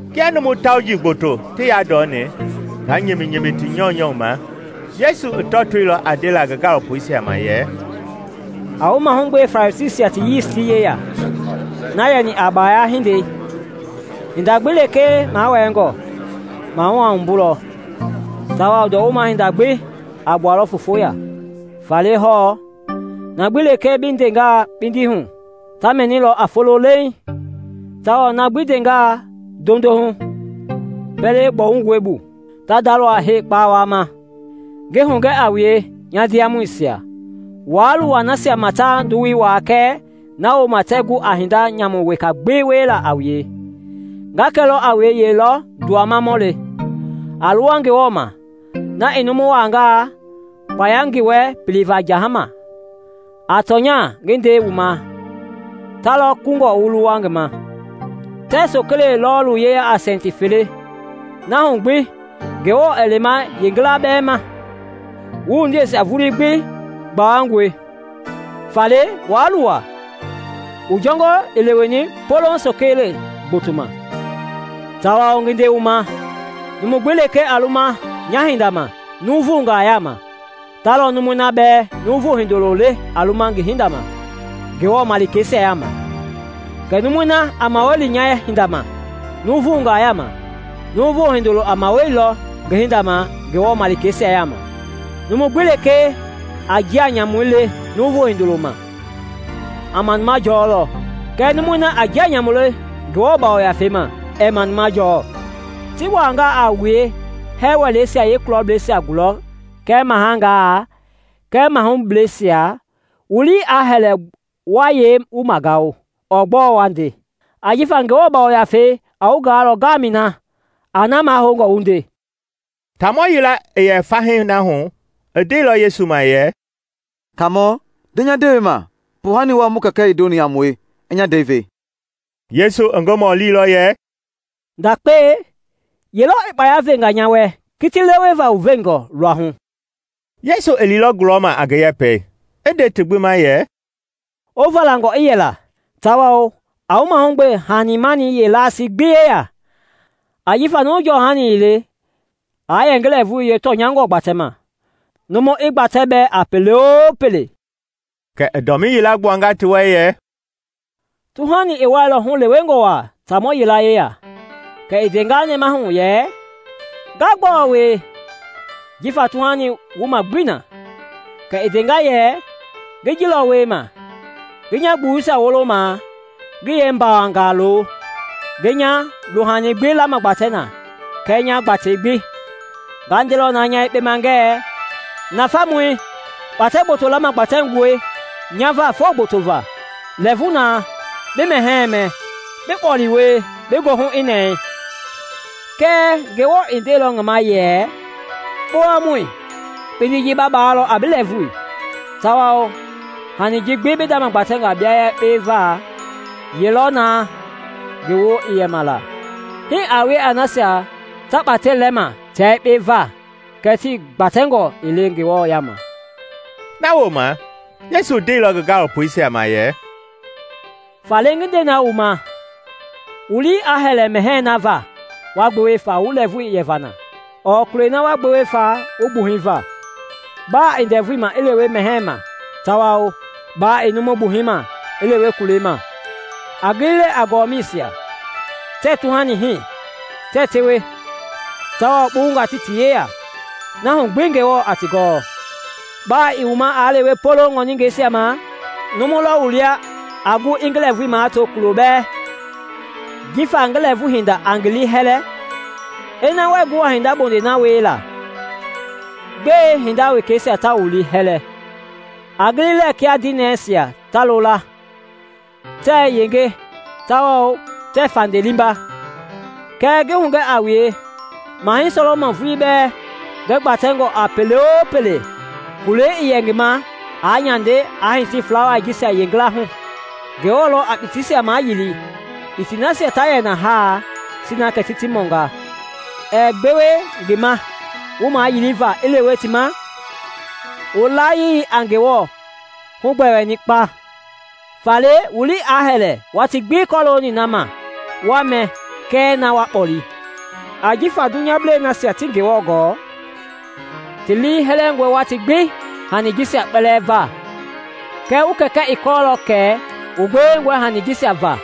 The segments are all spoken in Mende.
Kia numu tauji gboto ti yandɔni, ta nyiminyimi ti nyɔunyɔ ma, Yesu i tɔtoilɔ a ndela ngi gaalopoisia ma yɛ, “A wu mahugbe Farisiisia ti yiisti yeya, na yɛni a baaya hindei. Hinda gbi lekee mawɛɛngɔ, mahu a wumbulɔ, tawao ndɔwuma-hinda gbi a gbualɔ foofo ya. Faale hɔɔ, na gbi lekee bi ndenga kpindi hu, ta mɛnilɔ a folo leeŋ, tawao na bi ndenga ndondo hu pɛlɛ gbɔwungɔi bu, ta ndalɔ a hee kpawama. “Ngi hugɛ a wue, nya ndiamɔisia, waa luwa nasia ma ta nduwui waa kɛɛ na wooma tɛɛ gu a hinda nyamu weka gbi wiela a wue. Nga kɛlɔ a wue ye lɔ nduwamamɔle; a luwa Ngewɔ ma, na i numu wangaa, kpaya i ngi wɛ piliva jahama; a tɔnya, ngi nde wu ma, ta lɔ kungɔ wu luwa ngi ma! “Tɛɛ sokele lɔɔlu yeya a sɛnti fele. Na hu gbi Ngewɔ ɛɛ lema yeengila bɛɛ ma. Wu wundiei vulii gbi gbawangɔe. Faale waa luwa; wu jɔngɔi i leweni poloŋ sokele gboto ma. “Tawao ngi nde wu ma, numu gbi lekee a luma nya hinda ma nuuvungaa yama, ta lɔ numui na bɛɛ Nuuvu Hindoloi le a luma ngi hinda ma Ngewɔ Malikeisia yama; kɛɛ numui na a mawali nya hinda ma nuuvungaa yama, Nuuvu Hindoloi a mawalilɔ ngi hinda ma Ngewɔ malikeisia yama. “Numu gbi lekee a njia nyamu le Nuuvu Hindoloi ma, a manuma jɔlɔ; kɛɛ numui na a njia nyamu le Ngewɔ Yafei ma, ɛɛ manuma jɔɔ. “Ti wangaa a wue hɛɛ wɛleisia yeekulɔblɛisia gulɔ kɛɛ mahangaa kɛɛ mahubleisia, wu lii aa hɛlɛ wa yee wu magao ɔɔ gbɔɔ wa nde; ajifa Ngewɔ Yafei a wu gaalɔ ngamɛi na a na mahoungɔ wu nde.” Taamɔ yila i yɛ fahii na hu i ndeilɔ Yesu ma yɛ, “Kaamɔ, nde nya ndewei ma, poohani wɔɔ mu kɛkɛ i ndoni a mue, i nya ndɛi ve.” Yesu i ngi mɔlilɔ yɛ, “Ndakpei, ye lɔ i kpaya venga nya wɛ kiti leweva wu veenjɔ luahu?” Yesu i liilɔ gulɔma a ngi yɛpɛi i nde ti gbi ma yɛ, “Wu valangɔ i yɛla tawao a wu mahugbe hani-mani yeelasii gbi yeya; ajifa numu jɔhani ii le aa yɛ ngi lɛɛvui yeetɔnyangɔi gbatɛma, numu i gbatɛ bɛɛ a pele-o-pele.” Kɛ i dɔmii yila gbuanga ti wɛ yɛ, “Tuhani i wuɛilɔ hulewengɔ wa taamɔ yila yeya; Kɛ i ndenga nɛmahu yɛ, ‘Nga gbɔɔ wie, jifa tuhani wuma gbii na?’ Kɛ i ndenga yɛ, ‘Ngi ji lɔ wiema: ngi nya gbuwuisia wolomaa ngi yeembambangaa lo; ngi nya luhani gbi lamagbatɛ na kɛɛ nya gbatei gbi. Nga ndelɔ na nya yekpe ma ngɛɛ, nafamui! Kpatɛ gboto lamagbatɛngɔe nya va foo gboto va; lɛɛvu na, bi mɛhɛɛ mɛ, bi kpɔle wie, bi goohu i nɛɛ.’ Kɛɛ Ngewɔ ndeilɔ ngi ma yɛ, ‘Kpowamɔi! Kpindi ji ba baalɔ a bi lɛɛvui: tawao hani ji gbi bi ndama gbatɛnga bia yekpe va, ye lɔ na ngi woo i yɛma la?’ “Hii a wie a nasia ta kpatɛi lɛma tia yekpe va kɛɛ ti gbatɛngɔ ii le Ngewɔ yama.” Na wooma Yesu ndeilɔ ngi gaalopoisia ma yɛ, “Faale ngi nde wu ma, wu lii aa hɛlɛ mɛhɛɛ na va wa gbewe fa wu lɛɛvui yɛva na ɔɔ kulei na wa gbewe fa wu gbuhɛi va. Ba i ndɛvui ma i lewe mɛhɛɛ ma tawao ba i numu gbuhɛi ma i lewe kulei ma. A gili lɛɛ a gɔmɛisia; tɛɛ tuhani hii, tɛɛ tewe, tawao kpuwungaa tii ti yeya; na hu gbi Ngewɔ a ti gɔ! Ba i wu ma i lewe poloŋ ŋɔingɛisia ma! Numu lɔ wu lia a gu i ngi lɛɛvui mato kulo bɛɛ jifa ngi lɛɛvui hinda a ngi liihɛlɛ? Ina wɛɛ gu a hinda wulo bondei na wiela, gbɛe hinda wekeisia ta wu liihɛlɛ? A gili lɛɛ kia dinɛisia ta loola; tɛɛ yenge tawao tɛɛ fande liimba. Kɛɛ ngi hugɛ a wue, Mahɛi Sɔlɔmɔn vulii bɛ, ngi gbatɛngɔ a pele-o-pele, kula ii yɛ ngi ma aa nyande aa hiti flawai jisia yeengila hu. Ngewɔ lɔ a kpitiisia mayili kpitii nasia ta yɛ na ha, sina kɛ ti ti mɔnga. Ɛɛ gbewe ngi ma wu mayiliva i lewe ti ma? Wu layii a Ngewɔ hugbɛɛni kpa! “Faale wu lii aa hɛlɛ watii gbi kɔlooni na ma wa mɛ kɛɛ na wa kpɔle, ( ajifa dunyablei nasia tii Ngewɔ gɔɔ, ti lii hɛlɛngɔe watii gbi hani jisia kpɛlɛɛ va.) Wu Kɛkɛ i kɔɔlɔ kɛ wu gbewengɔe hanii jisia va.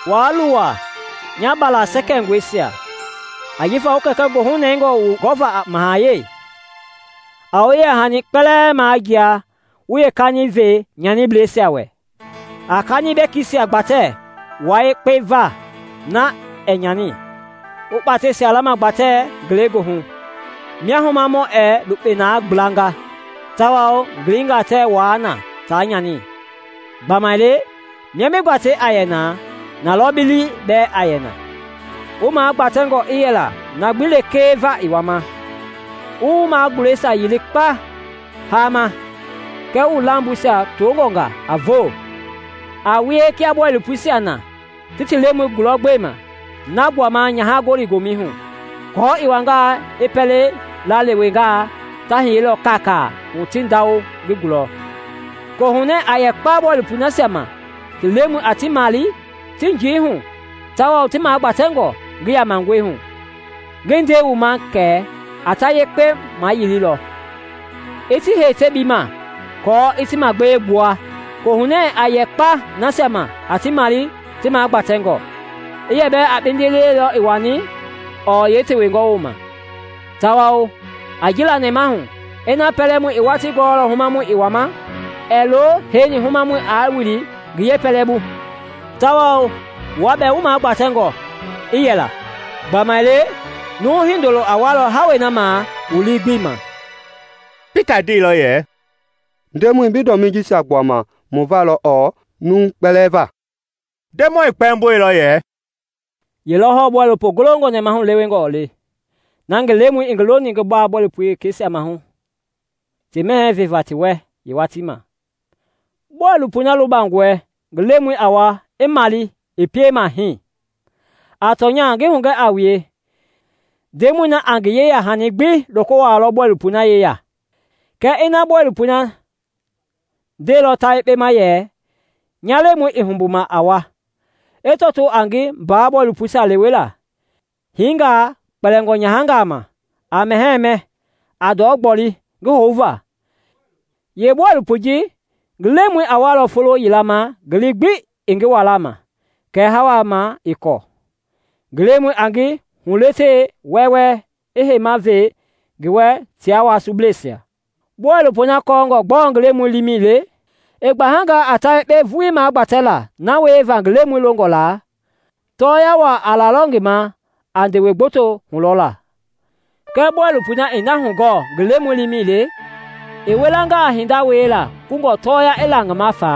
“Waa luwa, nya mbala sɛkɛngɔisia, ajifa wu kɛkɛ goohunɛngɔ wu gɔ va a mahayɛi. A wu yeya hanisia kpɛlɛɛ majia wu yeekani ve nyanibleisia wɛ. A kani bɛkisia gbatɛ wua yekpe va na ɛɛ nyani, wu kpateisia lamagbatɛ ngelegoohu, mia humamɔ ɛɛ lukpe na gblanga tawao gilinga tɛɛ wuaa na ta nyani. Gbamaile mia bi gbatei a yɛ na, na lɔ bi lii bɛɛ a yɛ na. “Wu magbatɛngɔ i yɛla na gbi lekee va i wama, wu wu magulɛisia yili kpauŋ hama kɛɛ wu lamboisia toongɔnga a voo. A wie kia bɔilopoisia na ti ti lemɔi gulɔ gbema na gbuama nyaha gɔli gomɛi hu, aako i wangaa i pɛleila lewengaa, ta hiyelɔ kaakaa hu ti ndawo ngi gulɔ. Kohunɛ a yɛ kpa bɔilopoi nasia ma ti lemɔi a ti male tii njii hu tawao ti magbatɛngɔ ngi yamangɔihu! Ngi nde wu ma kɛ a ta yekpe mayililɔ, i ti hei tebii ma, aako i ti magbee gbua. Kohunɛ a yɛ kpa nasia ma a ti male ti magbatɛngɔ, i yɛ bɛɛ a kpindiliɛ lɔ i wani ɔɔ yeetewengɔ woma. Tawao a ji la nɛmahu: Ina pɛlɛmɔi i watii gɔɔlɔ humamɔi a wua ma, ɛɛ lo heini humamɔi a wili ngi yeepɛlɛbu. Tawao wua bɛɛ, wu magbatɛngɔ i yɛla, gbamaile Nuu Hindoloi a walɔ hawei na ma wu lii gbii ma.” Pita ndeilɔ yɛ, “Ndemɔi, bi ndɔmii jisia gbuama mu valɔ ɔɔ numui kpɛlɛɛ va?” Ndemɔi kpɛmboilɔ yɛ, “Yelɔ hɔɔ bɔilopo golongɔ nɛmahulewengɔi le, na ngi lemɔi i ngi loni bɔilopo wekeisia maahu ti mɛhɛɛ veva ti wɛ yeewatii ma. “Bɔilopoi na lubangɔe ngi lemɔi a wa i male i piema hii! A tɔnya, ngi hugɛ a wue, ndemɔi na a ngi yeyahani gbi loko wuaalɔ bɔilopoi na yeya. “Kɛɛ ina bɔilopoi na ndeilɔ ta yekpe ma yɛ, ‘Nya lemɔi ii humbuma a wa’, i tɔtoo a ngi mbaa bɔilopoisia lewela, hinga kpɛlingɔ nyahangaa ma, a mɛhɛɛ mɛ, a ndɔ gboli ngi houva, yeebɔilopoi ji ngi lemɔi a walɔ folo yila ma ngi lii gbi ii ngi wala ma kɛɛ hawa ma ii kɔɔ. Ngi lemɔi a ngi huletelɔ wɛwɛ i heima ve ngi wɛ tia wasubleisia. “Bɔilopoi na kɔɔngɔ gbɔɔ ngi lemɔi liimɛi le, i gbahangaa a ta yekpe vuii magbatɛla na wieva ngi lemɔi longɔ la, tɔɔya waa a lalɔ ngi ma a ndewe gboto hulɔla; kɛɛ bɔilopoi na ii na hugɔɔ ngi lemɔi liimɛi le i wilangaa a hinda wiela kungɔ tɔɔya i la ngi ma fa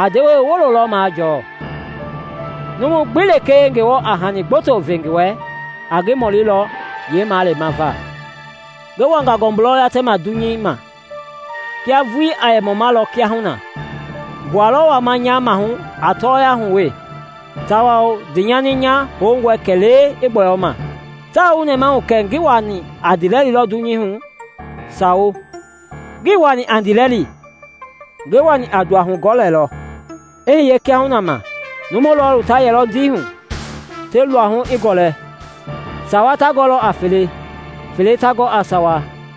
a ndewe wulo lɔ majɔɔ. Numu gbi lekee Ngewɔ a hani gboto ve ngi wɛ, a ngi mɔlilɔ yeemalema va.” “Ngi wanga ngɔmbu lɔ yatɛma dunyei ma; kiaa vuii aa yɛ mɔmalɔ kiahuna! Ngua lɔ wama nya maahu a tɔɔya hu we, tawao ndiinyani nya houngɔi kɛlee i gbɔyɔ ma. Taa wu nɛmahu kɛ ngi wani a ndiilɛli lɔ dunyei hu? Sawo, ngii wani a ndiilɛli, ngi wani a nduahugɔlɛ lɔ. I hiye kiahuna ma numu lɔɔlu ta yɛlɔ ndei hu, ti luahu i gɔlɛ, sawa ta gɔ a fele, fele ta gɔ a sawa.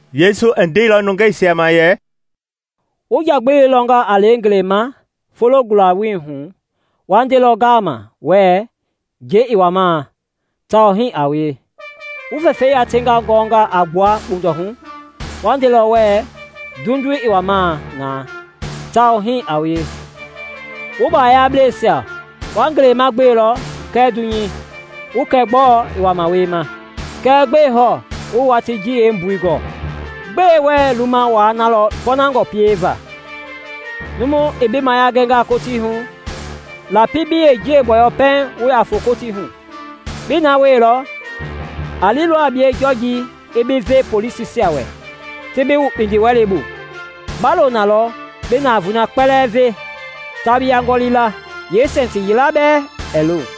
Yesu i ndeilɔ nungeisia ma yɛ, “Wu njagbili lɔnga a lɛ ngelei ma foloi gula-welei hu, wa ndelɔ ngama wɛɛ ‘Njɛi i wuamaa’; tawao hii a wie. Wu fɛfɛi yati gɔnga a gbua kpundɔhu, wa ndelɔ wɛɛ ‘Nduenduei i wamaa na’; tawao hii a wie. Wu bayablɛisia! Wa ngelei ma gbelɔ kɛɛ dunyei, wu kɛ gbɔɔ i wama wiema, kɛɛ gbɛɛ hɔɔ wuii watii ji yeembui gɔɔ? “Gbɛe wɛɛ luma wua na lɔ pɔɔnangɔ pieva? Numu i bi mayia gɛngaa Kotii hu, lapi bi yeenjiɛi gbɔyɔ pɛiŋ wu ya foo Kotii hu. Bii na wieilɔ, a lilɔ a bie Jɔjii i bi ve polisisia wɛ ti bi wu kpindiwɛlei bu. Ba lo na lɔ bi navoei na kpɛlɛɛ ve ta bi yangɔli la, yeesɛnti yila bɛɛ ɛɛ lo.”